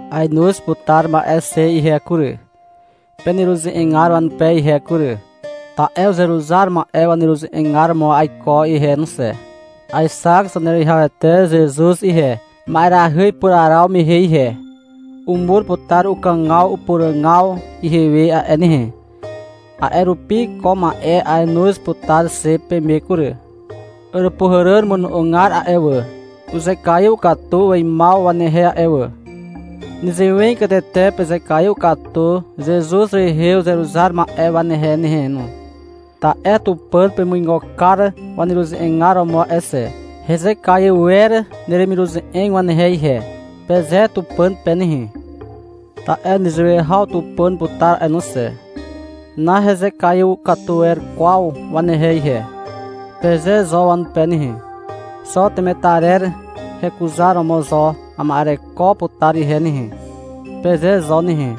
Aenoz putar ma'e xe ihe kury, peneruze'egar wanupe ihe kury. Ta'e uzeruzar ma'e waneruze'egar romo aiko ihe no xe. Aexak Zaneruwihawete Zezuz ihe, ma'erahy ipuraraw mehe ihe. Umur putar ukàgaw upuràgaw ihewe a'e nehe. A'e rupi ko ma'e ainoz putar xe peme kury. Àràpuhàràn mono'ogar a'e wà, uzekaiw katu weimaw wanehe a'e wà. Nezewegatete pezekaiw katu Zezuz rehe uzeruzar ma'e wanehe nehe no. Ta'e Tupàn pemuigo kar waneruze'egar romo a'e xe. Hezekaiw wer neremiruze'eg wanehe ihe, peze Tupàn pe nehe. Ta'e nezewe haw Tupàn uputar a'e no xe. — Nahezekaiw katu wer kwaw wanehe ihe, peze zo wanupe nehe. — Xo temetarer hekuzaromo zo ama'ereko putar ihe nehe, peze zo nehe.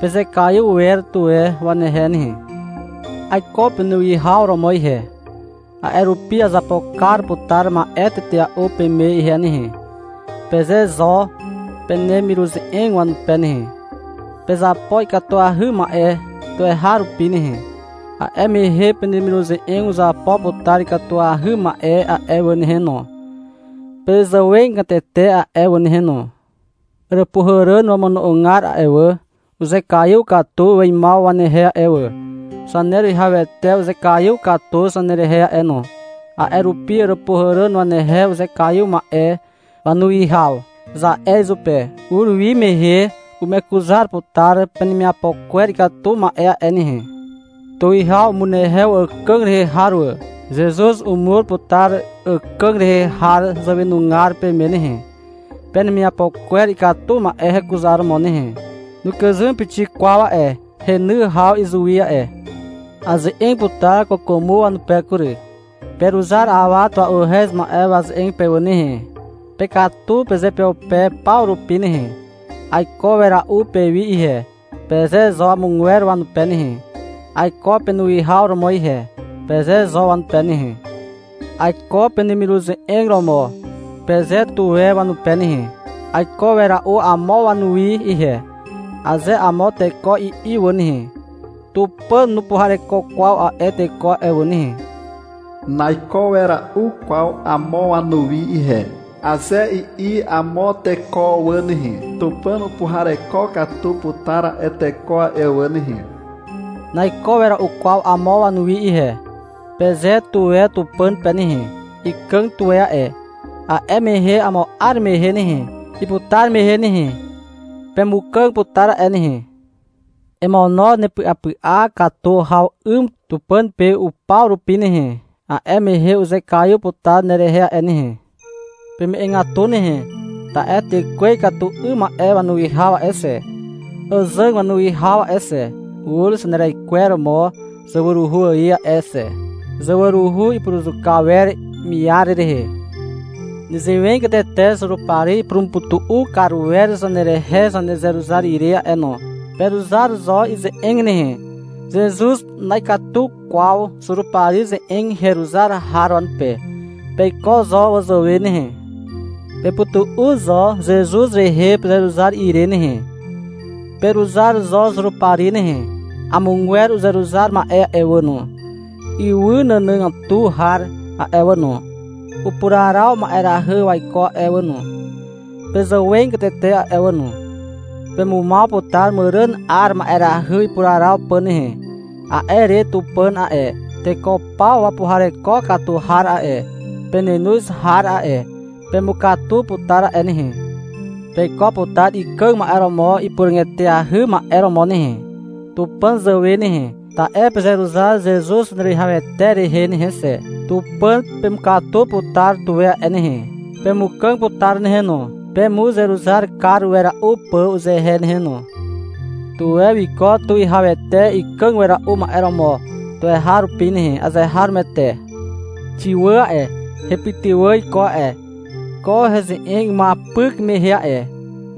Pezekaiw wer tuwe wanehe nehe. — Aiko penuwihaw romo ihe, a'e rupi azapo kar putar ma'e tetea'u peme ihe nehe, peze zo penemiruze'eg wanupe nehe. Pezapo ikatuahy ma'e tuweharupi nehe. A'e mehe penemiruze'eg uzapo putar ikatuahy ma'e a'e wà nehe no, pezàwegatete a'e wà nehe no. Àràpuhàràn wamono'ogar a'e wà, uzekaiw katu weimaw wanehe a'e wà. Zaneruwihawete uzekaiw katu zanerehe a'e no. A'e rupi — Àràpuhàràn wanehe uzekaiw ma'e wanuwihaw, za'e izupe. Ur wi mehe umekuzar putar penemiapo kwer ikatu ma'e a'e nehe. Tuwihaw umunehew àkàg rehe har wà. Zezuz umur putar àkàg rehe har zàwenugar peme nehe, penemiapo kwer ikatu ma'e hekuzaromo nehe. Nukàzym pixik kwaw a'e heny haw izuwi a'e. Aze'eg putar kwàkwàmo wanupe kury. Peruzar awa tua'uhez ma'e waze'eg pe wà nehe. Pekatu pezeupeupe paw rupi nehe. — Aiko wera'u pewi ihe, peze zo amogwer wanupe nehe. — Aiko penuwihaw romo ihe, peze zo wanupe nehe. — Aiko penemiruze'eg romo, peze tuwe wanupe nehe. — Aiko wera'u amo wanuwi ihe, aze amo teko i'i wà nehe, Tupàn nupuhareko kwaw a'e teko a'e wà nehe. — Naiko wera'u kwaw amo wanuwi ihe, aze i'i amo teko wà nehe, Tupàn upuhareko katu putar a'e teko a'e wà nehe. — Naiko wera'u kwaw amo wanuwi ihe, peze tuwe Tupàn pe nehe. Ikàg tuwe a'e. A'e mehe amo 'ar mehe nehe, iputar mehe nehe, pemukàg putar a'e nehe. Emono nepy'apy'a katu haw 'ym Tupàn pe upaw rupi nehe, a'e mehe uzekaiw putar nerehe a'e nehe. Peme'egatu nehe. Ta'e tekwe ikatu 'ym ma'e wanuwihaw a'e xe, àzàg wanuwihaw a'e xe, ur zaneraikweromo zawaruhu ài a'e xe. Zawaruhu ipuruzuka wer miar rehe. Nezewegatete Zurupari ipurumupytu'u kar wer zanerehe zanezeruzar ire a'e no. Peruzar zo ize'eg nehe. Zezuz na'ikatu kwaw Zurupari ze'eg heruzar har wanupe. Peiko zo wazàwe nehe. Pepytu'u zo Zezuz rehe pezeruzar ire nehe. Peruzar zo Zurupari nehe. Amogwer uzeruzar ma'e a'e wà no, ywy nànàgatu har a'e wà no, upuraraw ma'erahy waiko a'e wà no, pezàwegatete a'e wà no. Pemumaw putar màràn 'ar ma'erahy ipuraraw pà nehe. A'e re Tupàn a'e, teko paw wapuhareko katu har a'e, penenoz har a'e, pemukatu putar a'e nehe. Peiko putar ikàg ma'e romo ipuràg eteahy ma'e romo nehe, Tupàn zàwe nehe, ta'e pezeruzar Zezuz Zaneruwihawete rehe nehe xe. Tupàn pemukatu putar tuwe a'e nehe. Pemukàg putar nehe no, pemuzeruzar kar wera'u pà uzehe nehe no. Tuwe wiko tuwihawete ikàg wera'u ma'e romo tuweharupi nehe. Azeharomoete. Xiwàn a'e, hepytywà iko a'e, ko heze'eg imuapyk mehe a'e.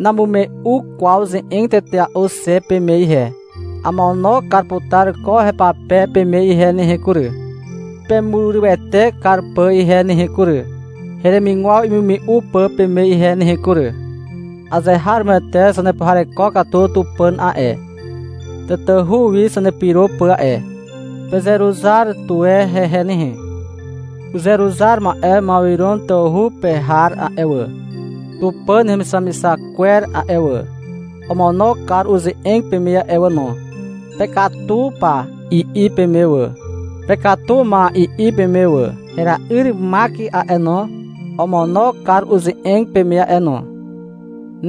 Namume'u kwaw ze'eg tetea'u xe peme ihe. Amono kar putar ko hepape peme ihe nehe kury, pemurywete kar pà ihe nehe kury, heremigwaw imume'u pà peme ihe nehe kury. Azeharomoete zanepuhareko katu Tupàn a'e, tatahu wi zanepyro pà a'e. Pezeruzar tuwe hehe nehe. Uzeruzar ma'e Mawiron tawhu pe har a'e wà, Tupàn hemixamixak kwer a'e wà, omono kar uze'eg peme a'e wà no. — Pekatu pa, i'i peme wà. — Pekatu ma, i'i peme wà. Hera'yr Mak a'e no, omono kar uze'eg peme a'e no.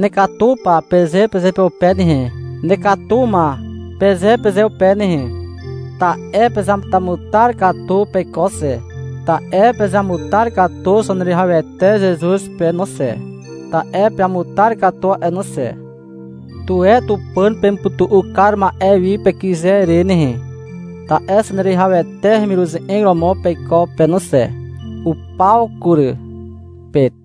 — Nekatu pa, peze pezeupeupe nehe, — Nekatu ma, peze pezeupe nehe. Ta'e pezeamutamutar katu peiko xe, ta'e pezamutar katu Zaneruwihawete Zezuz pe no xe, ta'e peamutar katu a'e no xe. Tuwe Tupàn pemupytu'u kar ma'e wi pekyze re nehe, ta'e Zaneruwihawete hemiruze'eg romo peiko pe no xe. Upaw kury. Pet.